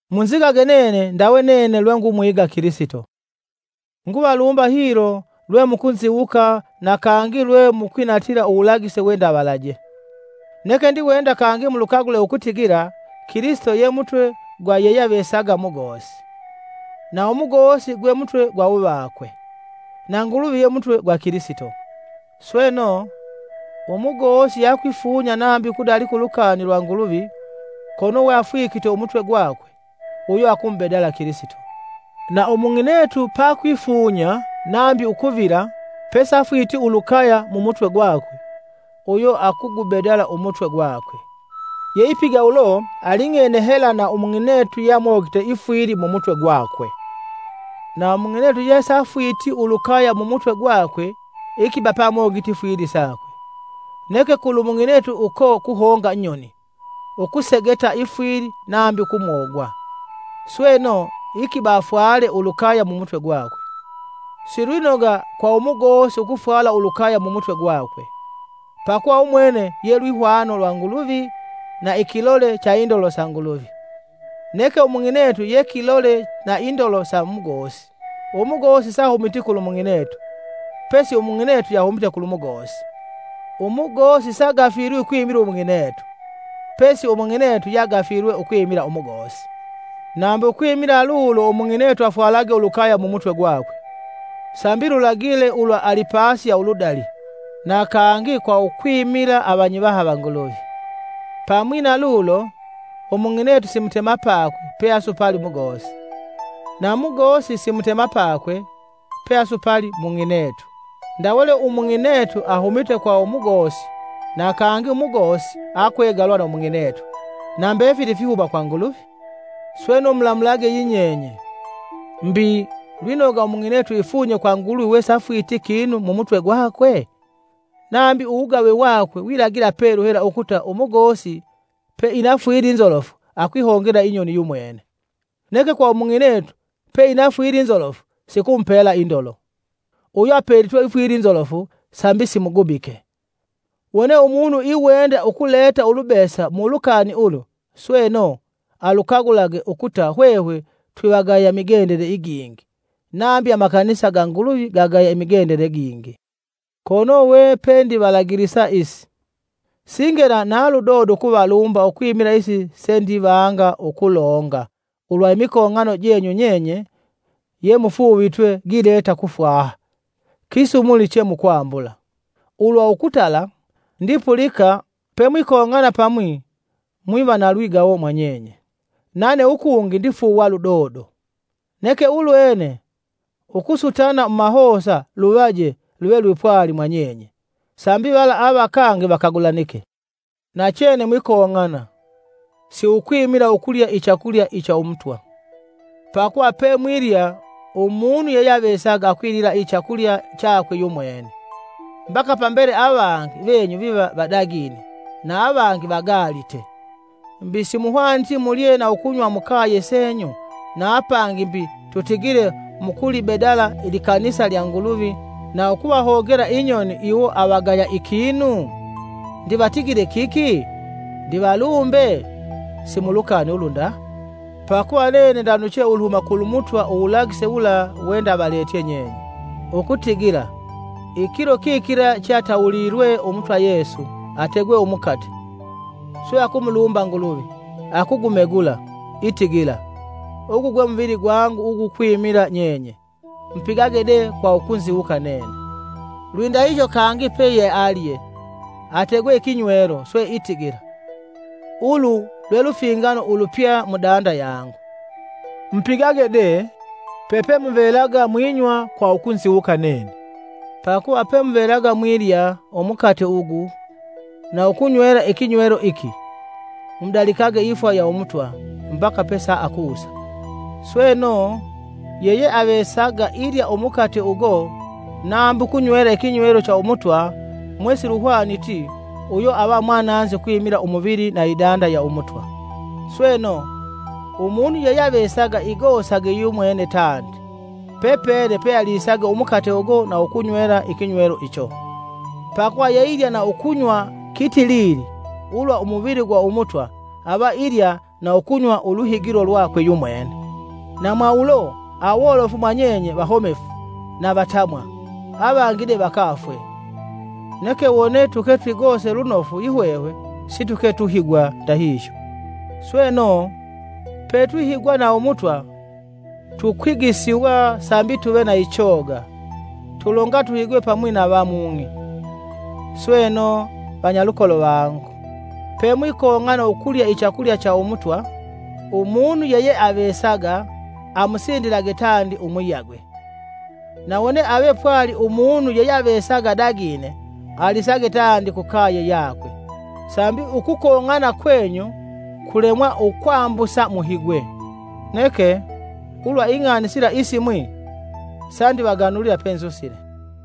Munzigage nene ndawe nene lwengumwiga Kilisito. Nguvalumba hilo lwe mukunziwuka na kangi lwe mukwinatila uwulagise wendavalaje. Neke ndiwenda kangi mulukagule ukutigila Kilisito ye Mutwe gwa yeyeavesaga mugosi, na umugosi gwe Mutwe gwa uvakwe, na Nguluvi ye Mutwe gwa Kilisito. Sweno, umugosi yakwifunya nambi ukudalika ulukani lwa Nguluvi kono we afwikite mumutwe gwakwe, uyo akumubedala Kilisito. Na umung'inetu pakwifunya nambi ukuvila pesafwiti ulukaya mumutwe gwakwe, uyo akugubedala umutwe gwakwe, yeipiga ulo aling'ene hela na umung'inetu yamogite ifwili mumutwe gwakwe. Na umung'inetu yesafwiti ulukaya mumutwe gwakwe, ikiba peamogite ifwili sakwe. Neke kulu mung'inetu uko kuhonga nyoni ukusegeta ifwili nambi ukumogwa, sweno, ikiba afwale ulukaya mumutwe gwakwe. Si lwinoga kwa umugosi ukufwala ulukaya mumutwe gwakwe, pakuva umwene ye lwihwano lwa Nguluvi na ikilole cha indolo sa Nguluvi, neke umung'inetu ye kilole na indolo sa umugosi. Umugosi saahumiti kulu mung'inetu, pesi umung'inetu yahumite kulu mugosi. Umugosi sagafilwi ukwimila umung'inetu, pesi umung'inetu yagafilwe ukwimila umugosi. Nambi ukwimila lulo umung'inetu afwalage ulukaya mumutwe gwakwe, sambi lulagile ulwa alipasi ya uludali, na kangi kwa ukwimila avanyivaha va Nguluvi. Pamwi na lulo, umung'inetu si mutemapakwe pe asupali umugosi, na mugosi si mutemapakwe pe asupali mung'inetu. Ndawe lwe umung'inetu ahumite kwa umugosi, na kangi umugosi akwegalwa na umung'inetu, na mbefili fihuma kwa Nguluvi. Sweno mulamulage yinyenye: Mbi, lwinoga umung'inetu ifunye kwa Nguluvi wesafwiti kinu mu mutwe gwakwe? Nambi uwugave wakwe wilagila pelu hela ukuta umugosi pe inafwili nzolofu akwihongela inyoni yumwene; neke kwa umung'inetu pe inafwili nzolofu sikumupela indolo, uyo apelitwe ifwili nzolofu sambi simugubike. Wone umunu iwenda ukuleta ulubesa mu ulukani ulu, sweno, alukagulage ukuta hwehwe twivagaya migendele igingi, nambi amakanisa ga Nguluvi gagaya imigendele gingi. Kono we pendivalagilisa isi, singela na ludodo ukuvalumba ukwimila isi sendivanga ukulonga ulwa imikong'ano jenyu nyenye yemufuuvitwe gileta kufwaha, kisumuli che mukwambula. Ulwa ukutala, ndipulika pemwikong'ana pamwi mwiva na lwigawo mwa nyenye. Nane ukungi ndifuuwa ludodo, Neke ulwene ukusutana mumahosa luvaje luve lwipwali mwa nyenye, sambi vala avakange vakagulanike. Nachene mwikong'ana, si ukwimila ukulya ichakulya icha Umutwa! Pakuva pemwilya umunu yeyeavesaga akwilila ichakulya chakwe yumwene, mbaka pambele avangi venyu viva vadagine, na avangi vagaalite! Mbi simuhwaniti mulye na ukunywa mukaye senyu! Na apangi mbi, tutigile mukulibedala ilikanisa lya Nguluvi na ukuvahongela inyoni iwo avagaya ikinu? Ndivatigile kiki? Ndivalumbe? Si mulukani ulu nda. Pakuva nene ndanuche uluhuma kwa Umutwa uwulagise wula wendavaletye nyenye: ukutigila, ikilo kikila cheatawulilwe Umutwa Yesu, ategwe umukate, swe akumulumba Nguluvi, akugumegula, itigila, “Ugu gwe muvili gwangu ugukwimila nyenye, mupigage de kwa ukunziwuka nene.” Lwindahihyo kangi peyealye, ategwe ikinywelo, swe itigila, “Ulu lwe lufingano ulupya mudanda yangu. Mupigage de, pepemuvelaga mwinywa kwa ukunziwuka nene.” Pakuva pemuvelaga mwilya umukate ugu na ukunywela ikinywelo iki, mudalikage ifwa ya Umutwa, mbaka pesaakusa. Sweno, yeyeavesaga ilya umukate ugo nambi ukunywela ikinywelo cha Umutwa mwe siluhwaniti, uyo ava mwananzi ukwimila umuvili na idanda ya Umutwa. Sweno umunu yeyeavesaga igosage umwene tandi, pepene pealisage umukate ugo na ukunywela ikinywelo icho; pakuva yeilya na ukunywa kitilili ulwa umuvili gwa Umutwa, ava ilya na ukunywa uluhigilo lwakwe yumwene. Na mwaulo, awolofu mwa nyenye vahomefu na vatamwa, avangi de vakafwe. Neke wone tuke twigose lunofu yihwehwe situke tuhigwa ndahihyo. Sweno, petwihigwa na Umutwa, tukwigisiwa sambi tuve na ichoga, tulonga tuhigwe pamwi na va mung'i. Sweno, vanyalukolo vangu, pemwikong'ana ukulya ichakulya cha Umutwa, umunu yeyeavesaga amusindilage tandi umuyagwe. Na wone ave pwali umunu yeyeavesaga adagine, alisage tandi kukaye yakwe, sambi ukukong'ana kwenyu kulemwa ukwambusa muhigwe. Neke, ulwa ing'ani sila isimwi, sandivaganulila penzusile.